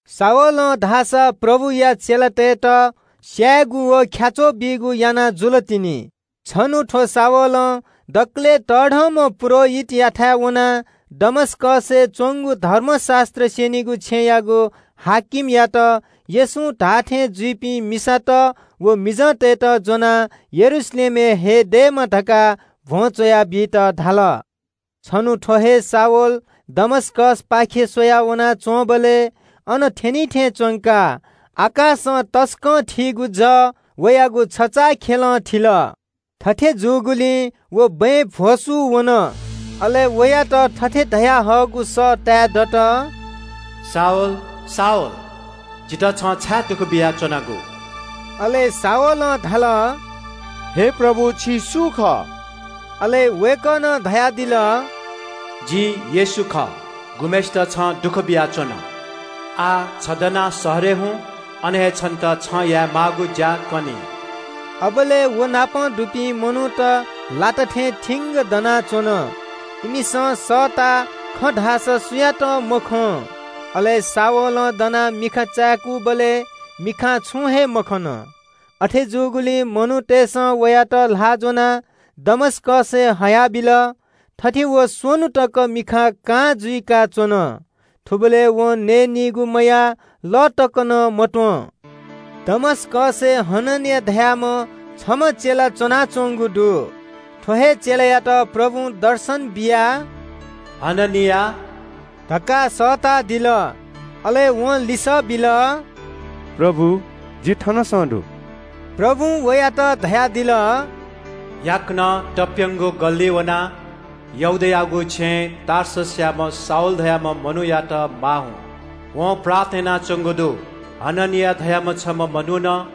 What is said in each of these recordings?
शाऊलं धाःसा प्रभुया चेलातय्‌त स्‍यायेगु व ख्‍याच्‍वः बीगु याना जुल तिनि। छन्‍हु थ्‍व शाऊलं दकलय् तःधंम्‍ह पुजाहारीयाथाय् वनाः दमस्‍कसय् च्‍वंगु धर्मशास्‍त्र स्‍यनीगु छेँयाम्‍ह कजीयात येशूं धाःथें जुइपिं मिसात व मिजंतय्‌त ज्‍वनाः यरूशलेमय् हये दयेमा धकाः भ्‍वं च्‍वया बीत धाल। छन्‍हु थ्‍व हे शाऊल दमस्‍कसपाखे स्‍वया वनाच्‍वंबलय् अन थ्‍यनिथें च्‍वंकाः आकाशं तसकं थीगु जः वयागु छचाःखेलं थिल। थथे जूगुलिं व बँय् भ्‍वसू वन। अले वयात थथे धयाहःगु सः ताये दत – “शाऊल, शाऊल, जितः छं छाय् दुःख बियाच्‍वनागु?” अले शाऊलं धाल – “हे प्रभु, छि सु खः?” अले वय्‌कलं धयादिल – “जि येशू खः, गुम्‍हय्‌सित छं दुःख बियाच्‍वन। आः दनाः शहरय् हुँ, अन हे छन्‍त यायेमाःगु ज्‍या कनी।” अबलय् व नाप दुपिं मनूत वातां दनाच्‍वन। इमिसं सःताः, खँ धाःसा सुयातं मखं। अले शाऊलं दनाः मिखा चाय्‌कूबलय् मिखां छुं हे मखन। अथे जूगुलिं मनूतय्‌सं वयात ल्‍हाः ज्‍वनाः दमस्‍कसय् हयाबिल। थथे व स्‍वन्‍हु तक मिखा कां जुइकाच्‍वन। थुबलय् वं नयेनीगु मयाः, लः तक नं मत्‍वं। दमस्‍कसय् हननिया धाःम्‍ह छम्‍ह चेला च्‍वनाच्‍वंगु दु। थ्‍व हे चेलायात प्रभुं दर्शन बियाः – “हननिया” धकाः सःतादिल। अले वं लिसः बिल – “प्रभु, जि थनसं दु।” प्रभुं वयात धयादिल – “याकनं तप्‍यं धाःगु गल्‍लिइ वनाः यहूदायागु छेँय् टार्ससयाम्‍ह शाऊल धाःम्‍ह मनूयात माः हुँ। वं प्रार्थना यानाच्‍वंगु दु। हननिया धाःम्‍ह छम्‍ह मनुखं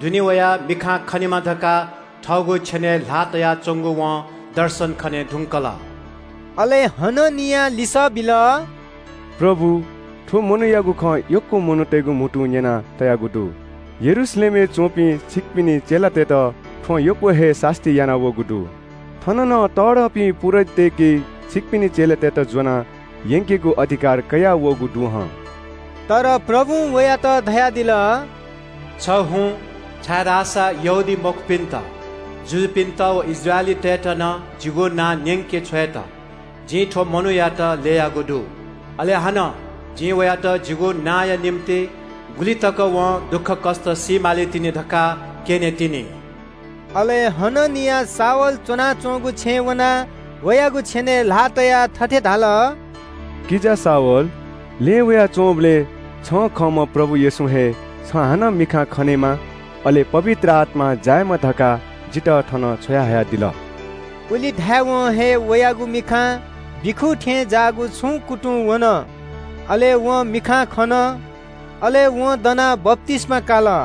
दुने वयाः मिखां खनेमा धकाः थःगु छेनय् ल्‍हाः तयाच्‍वंगु वं दर्शन खने धुंकल।” अले हननियां लिसः बिल – “प्रभु, थ्‍व मनूयागु खँ यक्‍व मनूतय्‌गु म्‍हुतुं न्‍यना तयागु दु। यरूशलेमय् च्‍वंपिं छिकपिनि चेलातय्‌त थ्‍वं यक्‍व हे सास्‍ती यानावःगु दु। थन नं तःधंपिं पुजाहारीतय्‌के छिकपिनि चेलातय्‌त ज्‍वनाः यंकेगु अधिकार कयाः वःगु दु हं।” तर प्रभुं वयात धयादिल – “छ हुँ छाय्‌धाःसा यहूदीमखुपिन्‍त, जुजुपिन्‍त व इस्राएलीतय्‌त नं जिगु नां न्‍यंके छ्वयेत जिं थ्‍व मनूयात ल्‍ययागु दु। अले हानं जिं वयात जिगु नांया निंतिं गुलि तक वं दुःखकष्‍ट सी मालीतिनि धकाः क्‍यनेतिनि।” अले हननियां शाऊल च्‍वनाच्‍वंगु छेँय् वनाः वयागु छेनय् ल्‍हाः तयाः थथे धाल – “किजा शाऊल, लँय् वयाच्‍वंबलय् छिं खंम्‍ह प्रभु येशूं हे छिं हानं मिखां खनेमा, अले पवित्र आत्‍मां जायेमा धकाः जितः थन छ्वयाहयादिल।” उलि धायेवं हे वयागु मिखां बिखू थें ज्‍याःगु छुं कुतुंवन, अले वं मिखां खन। अले वं दना वनाः बप्‍तिस्‍मा काल।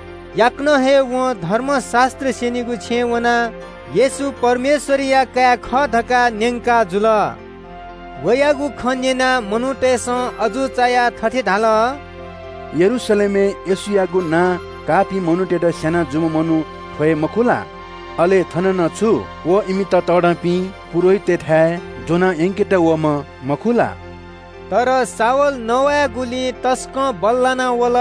याकनं हे वं धर्मशास्‍त्र स्‍यनीगु छेँय् वनाः – “येशू परमेश्‍वरया काय् खः” धकाः न्‍यंकाजुल। वयागु खँ न्‍यनाः मनूतय्‌सं अजू चायाः थथे धाल – “यरूशलेमय् येशूयागु नां काःपिं मनूतय्‌त स्‍याना जूम्‍ह मनू थ्‍व हे मखु ला? अले थन नं छु व इमित तःधंपिं पुजाहारीतय्‌थाय् ज्‍वना यंकेत वःम्‍ह मखु ला?” तर शाऊल नवायेगुलिइ तसकं बल्‍लाना वल।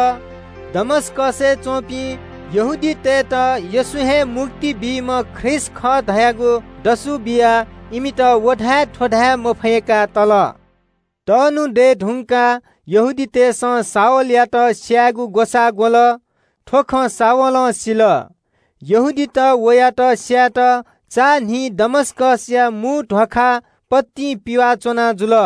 दमस्‍कसय् च्‍वंपिं यहूदीतय्‌त येशू हे मुक्ति बीम्‍ह ख्रीष्‍ट खः धयागु दसु बियाः इमित व धाये थ्‍व धाये मफय्‌का तल। तःन्‍हु दये धुंकाः यहूदीतय् नायःतय्‌सं शाऊलयात स्‍यायेगु ग्‍वसाः ग्‍वल। थ्‍व खँ शाऊलं सिल। यहूदीत वयात स्‍यायेत चान्‍हिं दमस्‍कसया ध्‍वाखा पतिं पिवाः च्‍वना जुल।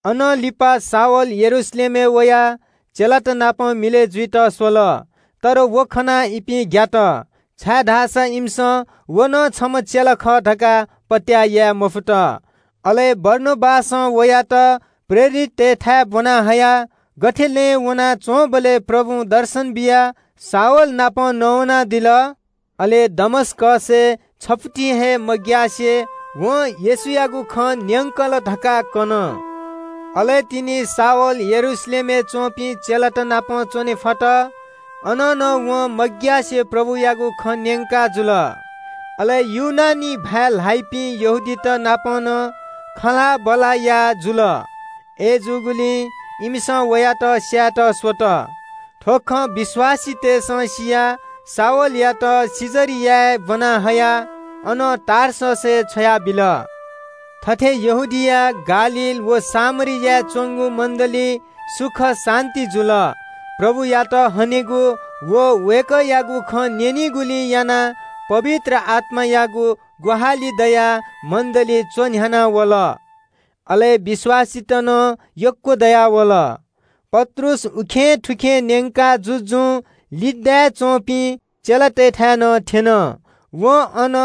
अनं लिपा शाऊल यरूशलेमय् वयाः चेलात नाप मिलय् जुइत स्‍वल, तर व खनाः इपिं ग्‍यात, छाय्‌धाःसा इमिसं व नं छम्‍ह चेला खः धकाः पत्‍याः याये मफुत। अले बारनाबासं वयात प्रेरिततय्‌थाय् ब्‍वना हयाः गथे लँय् वनाच्‍वंबलय् प्रभुं दर्शन बियाः शाऊल नाप नवानादिल, अले दमस्‍कसय् छफुति हे मग्‍यासे वं येशूयागु खँ न्‍यंकल धकाः कन। अले तिनि शाऊल यरूशलेमय् च्‍वंपिं चेलात नाप च्‍वने फत। अन नं वं मग्‍यासे प्रभुयागु खँ न्‍यंकाजुल। अले ग्रीक भाय् ल्‍हाइपिं यहूदीत नाप नं जवाःसवाः याः जुल। अय्‌जूगुलिं इमिसं वयात स्‍यायेत स्‍वल। थ्‍व खँ विश्‍वासीतय्‌सं सियाः शाऊलयात कैसरियाय् ब्‍वना हयाः अनं टार्ससय् छ्वयाबिल। थथे यहूदिया, गालील व सामरियाय् च्‍वंगु मण्‍डलीइ सुख शान्‍ति जुल। प्रभुयात हनेगु व वय्‌कःयागु खँ न्‍यनिगुलिं यानाः पवित्र आत्‍मायागु ग्‍वाहालि दयाः मण्‍डली च्‍वन्‍ह्याना वल, अले विश्‍वासीत नं यक्‍व दयावल। पत्रुस उखेंथुखें न्‍यंका जुजुं लुड्डाय् च्‍वंपिं चेलातय्‌थाय् नं थ्‍यन। वं अन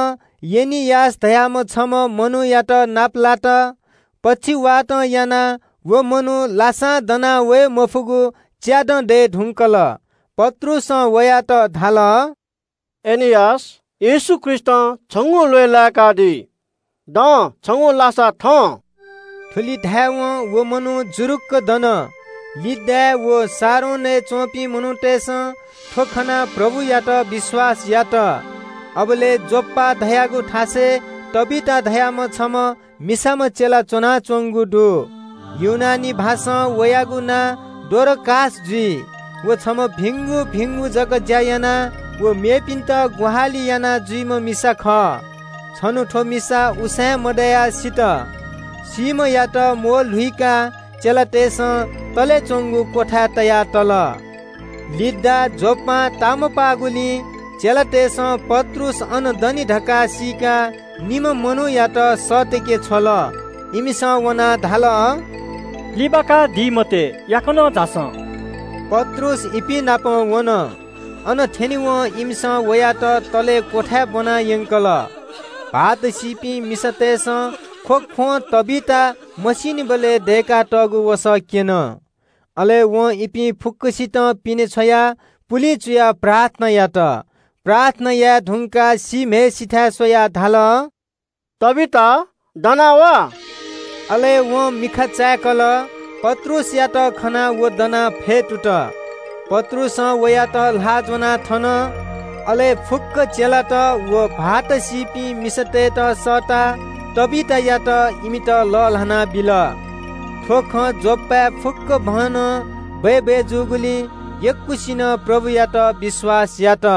एनियास धाःम्‍ह छम्‍ह मनूयात नापलात। पक्षवातं यानाः व मनू लासां दनावये मफुगु च्‍यादँ दये धुंकल। पत्रुसं वयात धाल – “एनियास, येशू ख्रीष्‍टं छिगु ल्‍वय् लाय्‌कादी। दनादिसँ, छिगु लासा थनादिसँ।” थुलि धायेवं व मनू जुरुक्‍क दन। लुड्डाय् व शारोनय् च्‍वंपिं मनूतय्‌सं थ्‍व खनाः प्रभुयात विश्‍वास यात। अबलय् योप्‍पा धाःगु थासय् तबीता धाःम्‍ह छम्‍ह मिसाम्‍ह चेला च्‍वनाच्‍वंगु दु। ग्रीक भाषां वयागु नां डोरकास जुइ। व छम्‍ह भिंगु भिंगु जक ज्‍या याना व मेपिन्‍त ग्‍वाहालि यानाजुइम्‍ह मिसा खः। छन्‍हु थ्‍व मिसा उसाँय् मदयाः सित। सीम्‍हयात म्‍वःल्‍हुकाः चेलातय्‌सं तले च्‍वंगु क्‍वथाय् तया तल। लुड्डा योप्‍पां तामपाःगुलिं चेलातय्‌सं पत्रुस अन दनि धकाः सीकाः निम्‍ह मनूयात सःतके छ्वल। इमिसं वनाः धाल – “लिबाकादी मते, याकनं झासँ।” पत्रुस इपिं नाप वन। अन थ्‍यनेवं इमिसं वयात तले क्‍वथाय् ब्‍वनायंकल। भाःत मदुपिं मिसातय्‌सं ख्‍वख्‍वं तबीता मसीनिबलय् वं इमिगु लागि दय्‌कातःगु वसः क्‍यन। अले वं इपिं फुक्‍कसितं पिने छ्वयाः पुलिं चुयाः प्रार्थना यात। प्रार्थना याये धुंकाः सीम्‍हय्‌सिथाय् स्‍वयाः धाल “तबीता, दना वा।” अले वं मिखा चाय्‌कल, पत्रुसयात खनाः व फ्‍यतुत। पत्रुसं वयात ल्‍हाः ज्‍वनाः थन। अले फुक्‍क चेलात व भाःत मदुपिं मिसातय्‌त सःताः तबीतायात इमित लःल्‍हाना बिल। थ्‍व खँ योप्‍पाय् फुक्‍कभनं बय्‌बय् जूगुलिं यक्‍वसिनं प्रभुयात विश्‍वास यात।